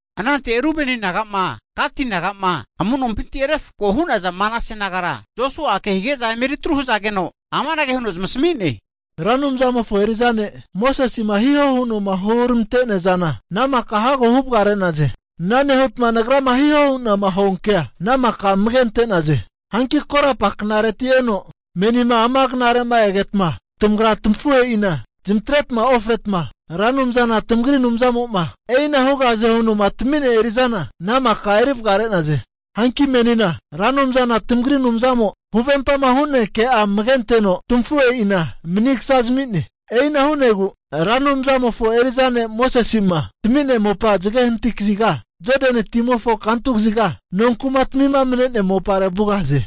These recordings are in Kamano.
Anante Rubeni naga'ma Gati naga'ma, amu'nompinti refko hu'naza Manase nagara Josua'a kehige'za eme eri tru hazageno, amanage huno zamasami'ne, Ra Anumzamofo eri'za ne' Mosese'ma hihoma huno'ma huramante'nea zana ana maka hago huvagare'naze. Ana nehutma nagrama hihoma hu'na huankea ana maka amage ante'naze. Hanki korapa knareti eno menima ama knare'ma egetma, tamagra tamafuhe'ina zamatreta ofretma, Ra Anumzana tamagri Anumzamo'ma e'ina hugahaze huno'ma tami'nea eri'zana ana maka erivagare'naze. Hanki menina Ra Anumzana tamagri Anumzamo huvempama hu'nea ke'a amage anteno tamafuhe'ina manigsa zami'ne. E'ina hu'negu Ra Anumzamofo eri'za ne' Mosese'ma tami'nea mopa zage hanati kaziga Jodani timofo kantu kaziga nonkumatamima mane'nea mopare vugahaze.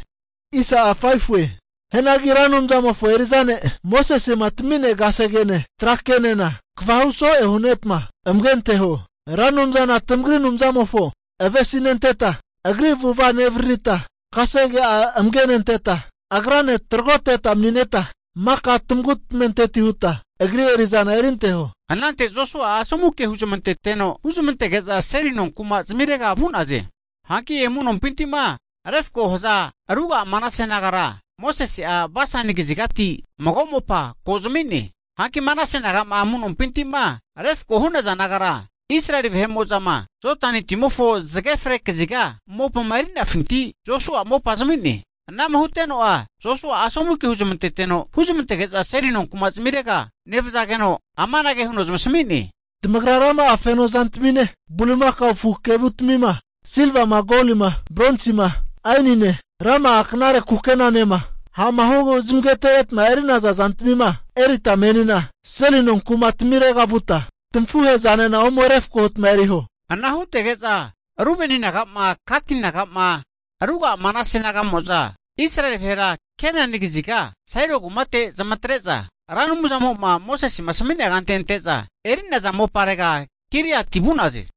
Hianagi Ra Anumzamofo eri'za ne' Mosese'ma tami'nea kasegene tra kenena kegava huso'e hu'netma amage anteho. Ra Anumzana tamagri Anumzamofo avesinenteta, Agri avu'ava nevaririta, kasege'a amage nenteta, Agrane tragoteta mani'neta, maka tamagu tamenteti hutma Agri eri'zana erinteho. Anante Josua'a asomu ke huzamanteteno huzmantege'za seli nonkuma zamirega vu'naze. Hanki amu'nompinti'ma refkoma haza ruga'a Manase nagara Mosese'a Basani kazigati mago mopa ko zami'ne. Hanki Manase naga'ma amu'nompinti'ma refkoma hu'naza nagara Israeli vahe'mo'za'ma Jodani timofo zage fre kaziga mopama erinafinti Josua'a mopa zami'ne. Anama huteno'a Josua'a asomu ke huzamanteteno huzamantege'za seli nonkuma zamirega nevzageno, amanage huno zamasami'ne, tamagra rama'a feno zantamine bulimakao afu kevutamima, silvama, golima, bronsima, aenine, rama'a knare kukenanema, ha'ma hu zamagatereta eri'naza zantamina erita menina seli nonkuma tamirega vuta tamafuhe'zanena ome refko huta eriho. Ana hutege'za, Rubeni naga'ma, Gati naga'ma, ruga'a Manase naga'mo'za Israeli vahera Kenani kaziga Sailo kumate zamatre'za, Ra Anumzamo'ma Mosese asami'nea kante ante'za eri'naza moparega Gileati vu'naze.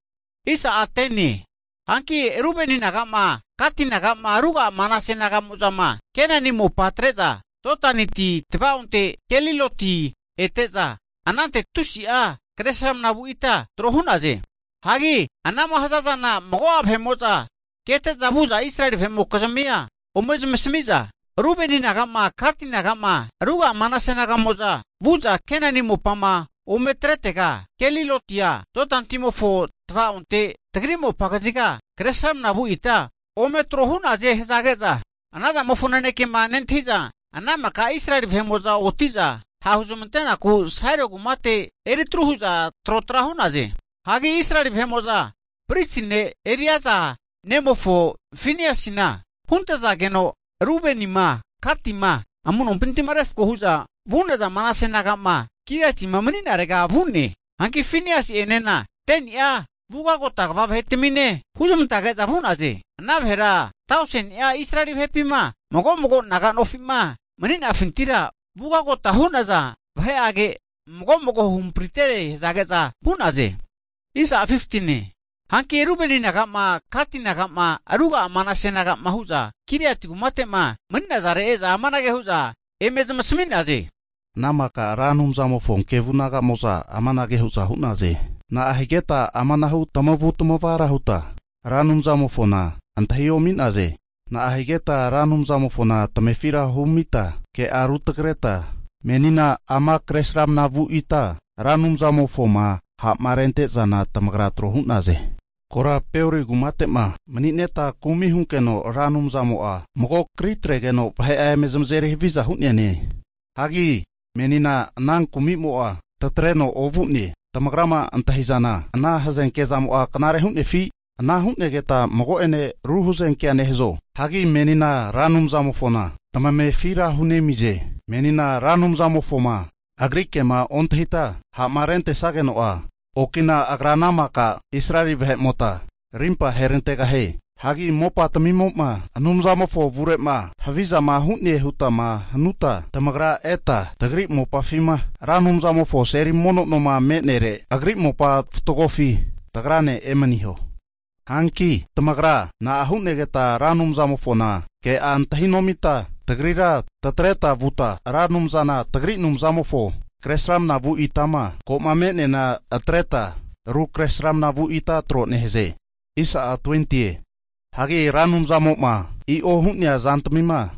Hanki Rubeni naga'ma, Gati naga'ma, ruga'a Manase naga'mo'zama Kenani Mopa atre'za Jodani ti tava'onte Geliloti ete'za, anante tusi'a kresramna vu ita tro hu'naze. Hagi anama hazazana mago'a vahe'mo'za kete'za vu'za Israeli vahe'mokizmia ome zmasami'za, Rubeni naga'ma, Gati naga'ma, ruga'a Manase naga'mo'za vu'za Kenani mopama ome atretega Gelilotia, Jodani timofo tavaonte tagri mopa kaziga, Kresramana vu ita ome tro hu'naze hazage'za, ana zamofo nanekema nentahi'za ana maka Israeli vahe'mo'za oti'za ha' huzmante'naku Sailo kumate eri tru hu'za trotra hu'naze. Hagi Israeli vahe'mo'za pristi ne' Eleazar nemofo Fineasina huntazageno, Rubenima, Gatima, amu'nompinti'ma refko hu'za vu'naza Manase naga'ma Gileatima mani'narega vu'ne. Hanki Finiasi'enena 10ni'a vugagota kva vahetamine huzmantazage'za vu'naze. Ana vahera tauseni'a Israeli vahepima mago'mago naga'nofi'ma mani'nafintira vugagota hu'naza vahe'age, mago'mago huhamprintetere hazage'za vu'naze. Hanki Rubeni naga'ma, Gati naga'ma, ruga'a Manase naga'ma hu'za Gileati kumate'ma mani'nare e'za amanage hu'za eme zamasmi'naze, ana maka Ra Anumzamofo kevu naga'mo'za amanage hu'za hu'naze. Na'ahigeta amanahu tamavu tamavara huta Ra Anumzamofona antahi omi'naze. Na'ahigeta Ra Anumzamofona tamefira humita ke'a rutagreta menina ama kresramna vu ita Ra Anumzamofoma ha'marente'zana tamagra tro hu'naze. Kora Peori kumate'ma, mani'neta kumi hunkeno Ra Anumzamo'a mago kri atregeno vahe'a eme zamazeri haviza hu'neane, hagi meninena ana kumimo'a tatreno ovu'ne. Tamagrama antahi'zana ana hazenke zamo'a knare hu'nefi, ana hu'negeta mago'ene ru hazenkea nehazo? Hagi menina Ra Anumzamofona tamamefira hunemize, menima Ra Anumzamofoma Agri kema ontahita ha'ma rentesageno'a, okina Agra ana maka Israeli vahe'mota rimpa aherantegahie. Hagi mopa tamimo'ma Anumzamofo avure'ma havizama hu'ne hutama hanuta, tamagra eta tagri mopafima Ra Anumzamofo seli mono noma me'nere, Agri mopa fatgofi tagrane emaniho. Hanki tamagra na'a hu'negeta Ra Anumzamofona ke'a antahi nomita tagrira tatreta vuta, Ra Anumzana tagri Anumzamofo Kresramana vu itama ko'ma me'neana atreta, ru kresramna vu ita tro nehaze. Hagi Ra Anumzamo'ma i'o hu'nea zantamima,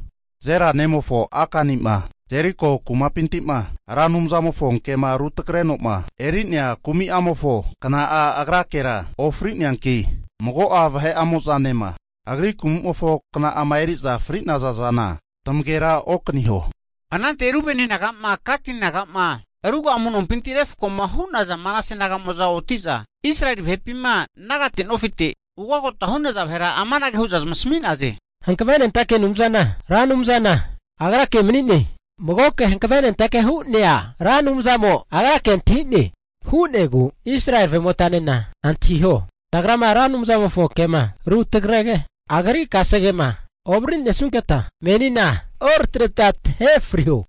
Zera nemofo Akani'ma Jeriko rankumapinti'ma Ra Anumzamofo ke'ma ru tagreno'ma eri'nea kumi'amofo kna'a agrakera ofri'neanki mago'a nema agri kumimofo kna'ama eri'za fri'naza zana tamagera okaniho. Anante Rubeni naga'ma, Gati naga'ma, ruga'a amu'nompinti refkoma hu'naza Manase naga'mo'za oti'za Israeli vahepima nagate nofite'ma ugagota hu'naza vahera amanage hu'za zamasmi'naze, hankavenentake Anumzana Ra Anumzana Agrake mani'ne, magoke hankavenentake hu'nea Ra Anumzamo Agra antahi'ne, hu'negu Israeli vahe'motanena antahiho, tagrama Ra Anumzamofo kema rutagrege, Agri kasegema ovariri nesunketa menina oratreta tahe friho.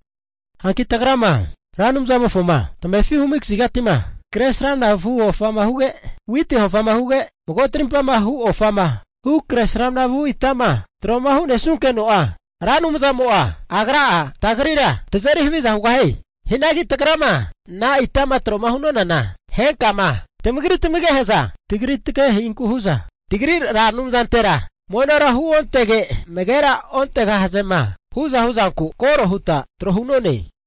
Hanki tagrama Ra Anumzamofoma tamefi humi kazigati'ma kresramna vu ofama huge, witi ofa huge, mago tarimpa hu ofama hu kresramna vu itama tro'ma hu'nesunkeno'a, Ra Anumzamo'a Agra'a tagrira tazeri haviza hugahie. Hianagi tagrama ana itama tro'ma hu'nonana, henkama tamagri tamagehe'za, tagri tageheinku hu'za, tagri Ra Anumzantera monora huontege, amagera ontegahazema hu'za hu'zanku koro huta tro hu'none.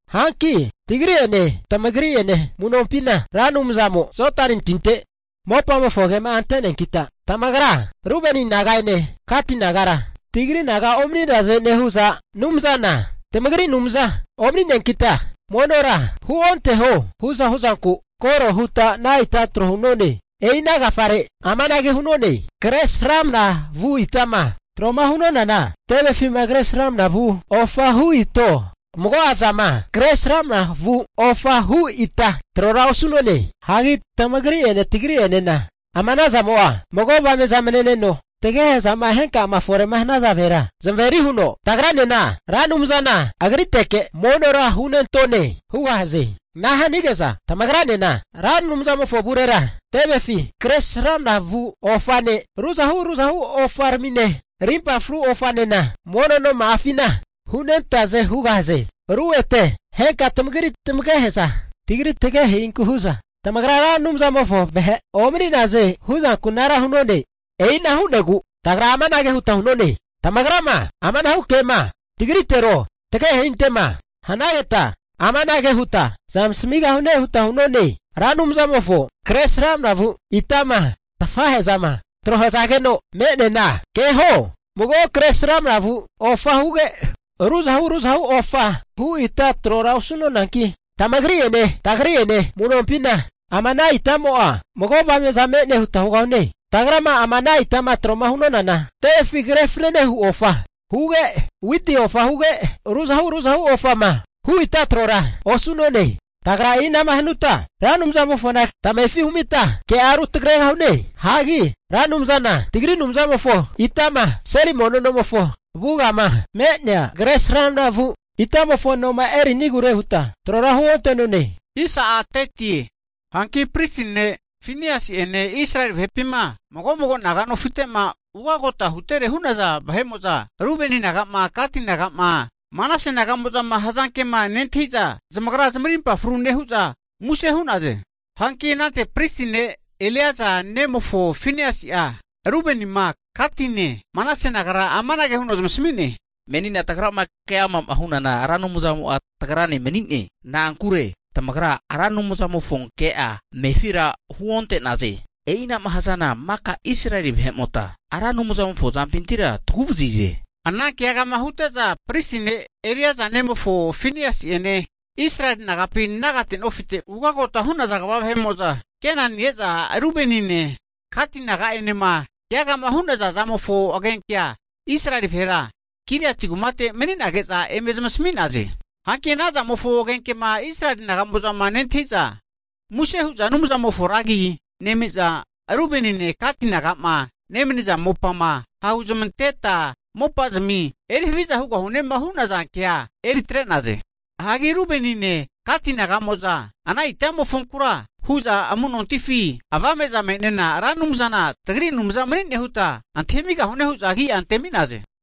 Hanki tagri'ene, tamagri'ene amu'nompina Ra Anumzamo Jodani tinte mopamofo agema'a ante'neankita, tamagra Rubeni naga'ene Gati nagara tagri naga omani'naze nehu'za, Anumzana tamagri Anumza omani'neankita monora huonteho hu'za hu'zanku koro huta ana ita tro hu'none. E'ina agafare amanage hu'none, kresramna vu itama tro'ma hu'nonana tevefima kresramna vu ofa hu ito, mago'a zama kresramna vu ofa hu ita trora osu'none. Hagi tamagri'ene tagri'enena ama anazamo'a mago avame'za mane'neno, tagehezama henkama fore'ma hanaza vahera zamaveri huno, tagranena Ra Anumzana Agriteke monora hunentone hugahaze. Ana hanige'za tamagranena Ra Anumzamofo avurera tevefi kresramna vu ofane, ruzahu ruzahu ofaramine, rimpa fru ofanena mono noma'afina hunentaze hugahaze. Ru ete henka tamagri tamagehe'za tagri tagehe'inku hu'za tamagra Ra Anumzamofo vahe omani'naze huzanku anara hu'none. E'ina hu'negu tagra amanage huta hu'none, tamagrama amanahu kema tagritero, tagehe'inte'ma hanageta amanage huta zamasmigahune huta hu'none, Ra Anumzamofo kresramna vu itama tafahezama tro hazageno me'neana keho, mago kresramna vu ofa huge, ruzahu ruzahu ofa hu ita trora osu'nonanki tamagri'ene tagri'ene amu'nompina, ama ana itamo'a mago avame'za me'ne huta hugahune. Tagrama ama ana itama tro'ma hu'nonana, tevefi kre fanane hu ofa huge, witi ofa huge, ruzahu ruzahu ofama hu ita trora osu'none. Tagra e'inama hanuta, Ra Anumzamofona tamefi humita ke'a rutagregahune. Hagi Ra Anumzana tagri Anumzamofo itama seli mono nomofo avugama me'nea kresramna vu itamofo noma eri'nigure huta trora huonte'none. Hanki pristi ne' Fineasi'ene Israeli vahepima mago mago naga nofite'ma ugagota hutere hu'naza vahe'mo'za, Rubeni naga'ma, Gati naga'ma, Manase naga'mo'zama hazankema nentahi'za, zamagra zamarimpa fru nehu'za muse hu'naze. Hanki anante pristi ne' Eleazari nemofo Finiasi'a, Rubenima, Gatine, Manase nagara amanage huno zamasami'ne, menina tagrama keama'ma hunana Ra Anumzamo'a tagrane mani'ne. Na'ankure tamagra Ra Anumzamofo ke'a tamefira huonte'naze, e'inama hazana maka Israeli vahe'mota Ra Anumzamofo azampintira tagu'vazize. Ana keagama hute'za pristi ne' Eleaza nemofo Finiasi'ene Israeli nagapi nagate nofite ugagota hu'naza kva vahe'mo'za ete Kenani e'za Rubenine, Gati, naga'enema keagama hu'naza zamofo agenkea Israeli vahera Gileati kumate mani'nage'za eme zamisami'naze. Hanki anazamofo agenkema Israeli naga'mo'zama nentahi'za muse hu'za Anumzamofo ra agi nemi'za, Rubenine, Gati naga'ma nemaniza mopama ha' huzamanteta mopazamima eri haviza hugahunema hu'naza ke'a eri atre'naze. Hanki Rubenine, Gati naga'mo'za ana itamofonkura hu'za Amu'nontifi Avame'za me'nena Ra Anumzana tagri Anumza mani'ne huta antahi amigahune hu'za agi'a antemi'naze.